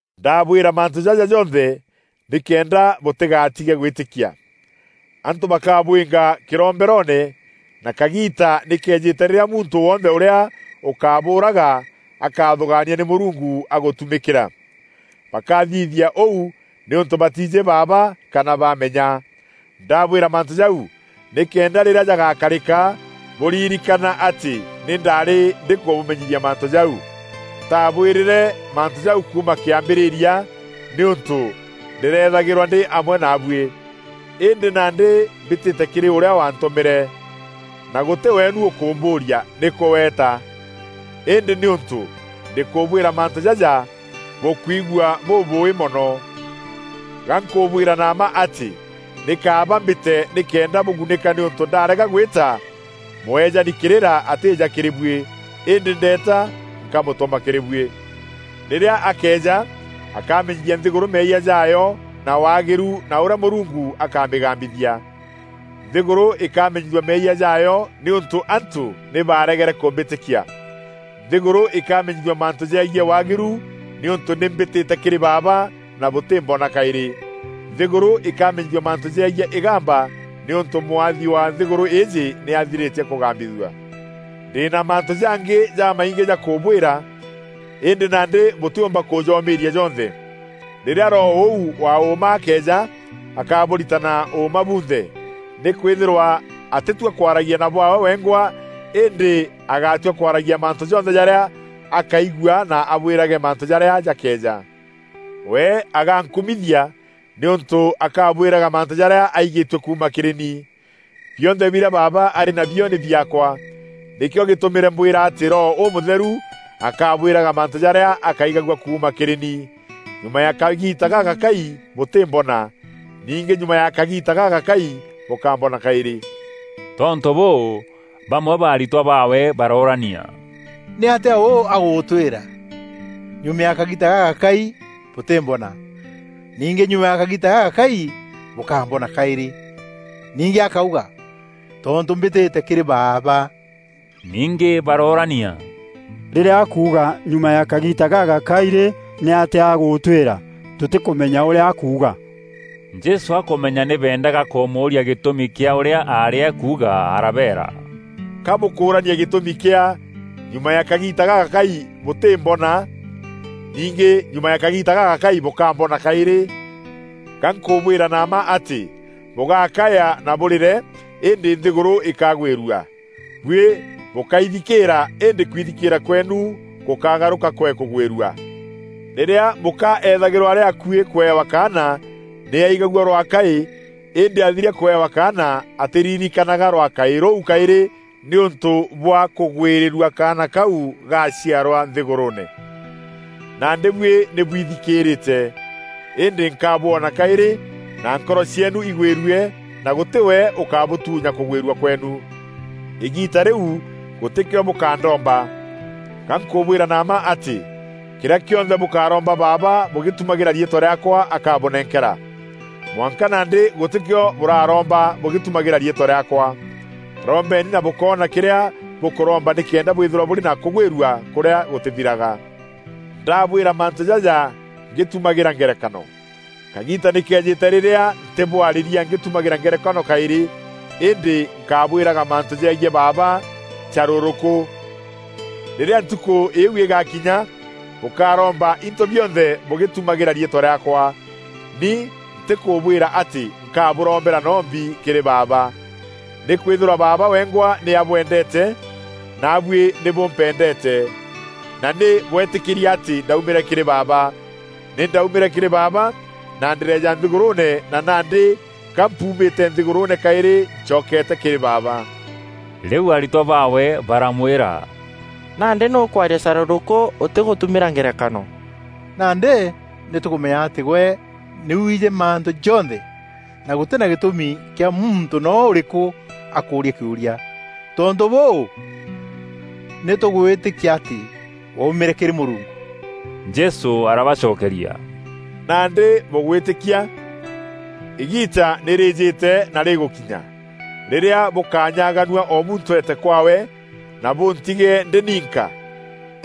“Ndabwîra mantû jaja jonthe, nîkenda bûtîgatige gwîtîkia. Antû bakabwînga kîromberoone na kagiita nî keejîte rîrîa muntû wonthe ûrîa ûkabûûraga, akathûgaania nî Mûrungu agûtumîkîra. Bakathithia ûu nîûntû batiijî Baaba kana baamenya. Ndabwîra mantû jau, nîkenda rîrîa jagakarîka bûrîrîkana atî nî ndaarî ndîkûbûmenyithia mantû jau. Ntaabwîrîre mantû jau kuuma kîambîrîria, nîûntû ndîreethagîrwa ndî amwe naabûî. “Îndî nandî mbîtîte kîrî ûrîa waantûmîre, na gûtî weenu ûkûmbûûria: ‘Nîkû weta?’ Îndî nîûntû ndîkûbwîra mantû jaja, bûkwigua bûbûûî mono. Ga nkûbwîra na mma atî, nî kaaba mbîte nîkenda bûgunîka nîûntû ndarega gwîta, Mûeejani kîrîra atîîja kîrî buî. Îndî ndeeta nkamûtûma kîrî buî. Rîrîa akeeja, akamenyithia nthîgûrû meeyia jaayo na waagîru na ûrîa Mûrungu akamîgambithia; nthîgûrû îkamenyithua meeyia jaayo nîûntû antû nî baregere kûmbîtîkia; nthîgûrû îkamenyithua mantû jegiî waagîru nîûntû nî mbîtîte kîrî Baaba, na bûtîmbona kaîrî; nthîgûrû îkamenyithua mantû jegiî îgamba nîûntû mwathi wa nthîgûrû îîjî nî athîrîtie kûgambithua. “Ndî na mantû jangî jamaingî ja kûbwîra, îndî nandî bûtîûmba kûjoomîîria jonthe. Rîrîa Roho ûu wa ûûma akeeja, akabûritana ûûma bûnthe. Nîkwîthîrwa atîtua kwaragia na bwaawe wengwa îndî agatua kwaragia mantû jonthe jarîa akaigua na abwîrage mantû jarîa jakeeja. We agankumithia, nîûntû akabwîraga mantû jarîa aîgîtue kuuma kîrî ni. Bionthe birîa Baaba arî nabio, nî biaakwa; nîkîo gîtûmîre mbwîra atî Roho Ûmûtheru akabwîraga mantû jarîa akaigagua kuuma kîrî ni. “Nyuma ya kagiita gagakai bûtîmbona. Ningî nyuma ya kagiita gagakai bûkambona kaîrî.” Tontû bûû, bamwe ba aritwa baawe baroorania, “Nîatîa ûû agûtwîra: ‘Nyuma ya kagiita gagakai bûtîmbona. Ningî nyuma ya kagiita gagakai bûkambona kaîrî.’ Ningî akauga ‘Tontû mbîtîte kîrî Baaba?’” Ningî baroorania, “Rîrîa akuuga ‘Nyuma ya kagiita gagakai rî, nîatîa agûtwîra?’ Tûtîkûmenya ûrîa akuuga.” Jesû akûmenya nî beendaga kûmûûria gîtûmi kîa ûrîa aarî akuuga arabeera, “Ka bûkûûrania gîtûmi kîa: ‘Nyuma ya kagiita gagakai bûtîmbona. Ningî nyuma ya kagiita gagakai bûkambona kaîrî?’ Ga nkûbwîra na mma atî, bûgakaya na bûrîre, îndî nthîgûrû îkagwîrua. Buî bûkaithikîîra îndî kwithikîîra kweenu gûkagarûka kwee kûgwîrua. Rîrîa mûka eethagîrwa arî akuî kûewa kaana, nî aigagua rwakaî, îndî athiria kûewa kaana, atîririkanaga rwakaî rûu kaîrî nîûntû bwa kûgwîrîrua kaana kau gaaciarwa nthîgûrûûne. Nandî buî nî bwithikîrîte; îndî nkabwona kaîrî, na nkoro cieenu igwîrue, na gûtî we ûkabûtuunya kûgwîrua kweenu. Îgiita rîu gûtîkîo bûkandomba. Ga nkûbwîra na mma atî, kîrîa kîonthe bûkaromba Baaba bûgîtumagîra riîtwa rîaakwa akabûnenkera. Mwanka nandî gûtîkîo bûraromba bûgîtumagîra riîtwa rîaakwa. Rombeni na bûkoona kîrîa bûkûromba nîkenda bwîthîrwa bûrî na kûgwîrua kûrîa gûtîthiraga. “Ndabwîra mantû jaja ngîtumagîra ngerekano. Kagiita nî keejîte rîrîa ntîbwarîria ngîtumagîra ngerekano kaîrî, îndî nkabwîraga mantû jegiî Baaba carûrûkû. Rîrîa ntukû îîu îgakinya bûkaromba into bionthe bûgîtumagîra riîtwa rîaakwa. Ni ntîkûbwîra atî nkabûrombera noo mbi kîrî Baaba, nîkwîthîrwa Baaba wengwa nî abwendeete, na buî nî bûmpendeete, na nî bweetîkîrie atî ndaumîre kîrî Baaba. Ni ndaumîre kîrî Baaba, na ndîreeja nthîgûrûûne na nandî ga mpuumîte nthîgûrûûne kaîrî ncokete kîrî Baaba.” Rîu aritwa baawe baramwîra, “Nandî nî ûkwaria carûrûkû ûtîgûtumîra ngerekano. Nandî nî tûkûmenya atî gwe nî wiijî mantû jonthe, na gûtî na gîtûmi kîa muntû noo ûrîkû akûûrîa kîûria. Tontû bûû, nî tûgwîtîkia atî waumîre kîrî Mûrungu.” Jesû arabacokeria, “Nandî bûgwîtîkia? Îgiita nî rîîjîte na rîgûkinya, rîrîa bûkanyaganua o muntû eete kwaawe, na bûntige ndî ninka.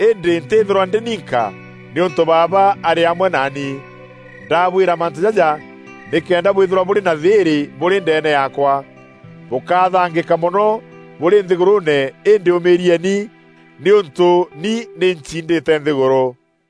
Îndî ntîîthîrwa ndî ninka, nîûntû Baaba arî amwe naani. Ndabwîra mantû jaja, nîkenda bwîthîrwa bûrî na thîîrî bûrî ndeene yaakwa. Bûkathangîka mono bûrî nthîgûrûûne îndî ûmîîrieni nîûntû ni nî ncindîte nthîgûrû.”